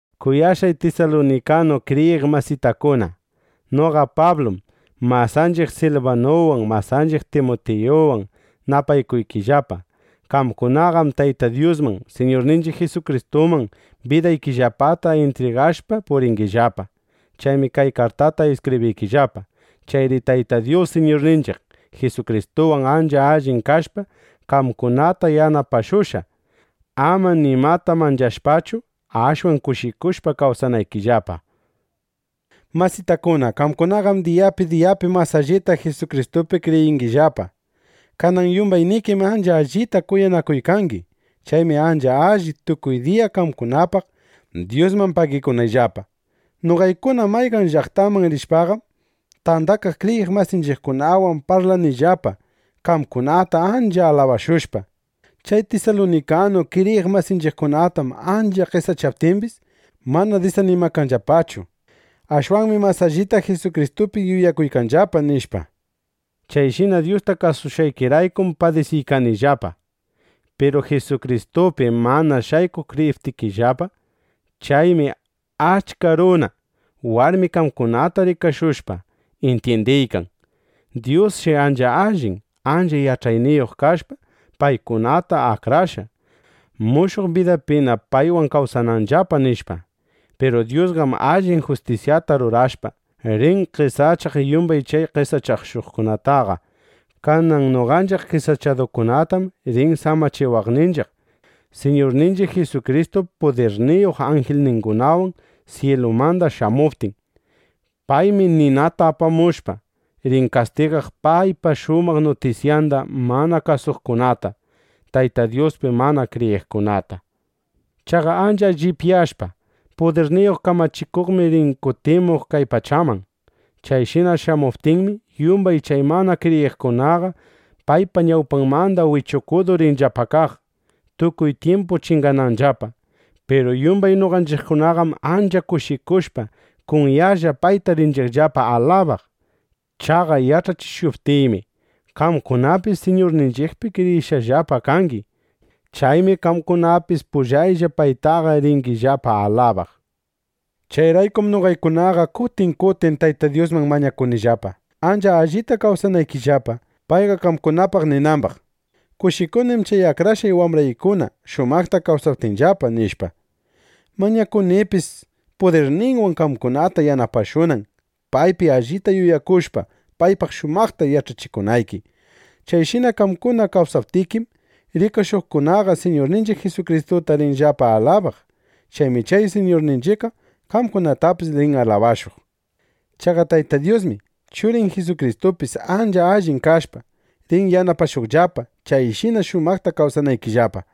Kuyashqay tisalunikanu kriyiq masitakuna, noqa Pablum, masanchiq Silbanuwan, masanchiq Timutiyuwan napaykuykillapa. Qamkunaqam Tayta Dyusman, Siñurninchiq Jisukristuman bidaykillapata intrigashpa puringillapa. Chaymi kay kartata iskibriykillapa. Chayri Tayta Dyus, Siñurninchiq Jisukristuwan ancha allin kashpa, qamkunata yanapashunqa, ama nimata manchashpachu, ashwan kushikushpa kawsanaykillapa. Masitakuna, qamkunaqam diyapi diyapi mas allita Jisukristupi kriyiykangillapa. Kanan yumbaynikim ancha allita kuyanakuykangi. Chaymi ancha alli, tukuy diya qamkunapaq Dyusman pagikunayllapa. Noqaykuna mayqan llaqtaman rishpaqam, tandakaq kriyiq masinchiqkunawan parlanillapa, qamkunata ancha alabashushpa: “Chay tisalunikanu kriyiq masinchiqkunatam ancha qesachaptimbis, mana disanimakanllapachu. Ashwanmi mas allita Jisukristupi yuyakuykanllapa”, nishpa. Chayshina Dyusta kasushqaykiraykum padisiykangillapa. Piru Jisukristupim mana shaykuq kriyiykangillapa. Chaymi achka runa, warmi qamkunata rikashushpa, intyindiykan: Dyusshi ancha allin, ancha yach'ayniyuq kashpa, paykunata akrashqa, mushuq bidapina paywan kawsananllapa, nishpa. Piru Dyusqam allin justisyata rurashpa, rin qesachaq yumbay chay qesachashuqtaqa. Kanan noqanchiq qesachadukunatam rin samachiwaqninchiq, Siñurninchiq Jisukristu pudirniyuq anjilningunawan syilumanda shamuptin. Paymi ninata apamushpa, rin kastigaq paypa shumaq nutisyanda mana kasuqkunata, Tayta Dyuspi mana kriyiqkunata. Chaqa ancha llipyashpa, pudirniyuq kamachikuqmi rin kutimuq kay pachaman. Chayshina shamuptinmi, yumbay chay mana kriyiqkunaqa paypa ñawpanmanda wichukudu rinllapa kaq, tukuy tyimpu chingananllapa. Piru yumbay noqanchiqkunaqam ancha kushikushpa, kunyalla payta rinchiqllapa alabaq. Chaqa yach'achishuptiymi, qamkunapis Siñurninchiqpi kriyishqallapa kangi. Chaymi qamkunapis pullayllapa paytaqa ringillapa alabaq. Chayraykum noqaykunaqa kutin kutin Tayta Dyusman mañakunillapa, ancha allita kawsanaykillapa, payqa qamkunapaq ninambaq: “Kushikunim chay akrashqay wambraykuna shumaqta kawsaptinllapa”, nishpa. Mañakunipis, pudirninwan qamkunata yanapashunan, paypi allita yuyakushpa, paypaq shumaqta yach'achikunayki. Chayshina qamkuna kawsaptikim, rikashuqkunaqa Siñurninchiq Jisukristuta rinllapa alabaq. Chaymi chay Siñurninchiqqa qamkunatapis rin alabashuq. Chaqa Tayta Dyusmi, Churin Jisukristupis ancha allin kashpa, rin yanapashuqllapa, chayshina shumaqta kawsanaykillapa.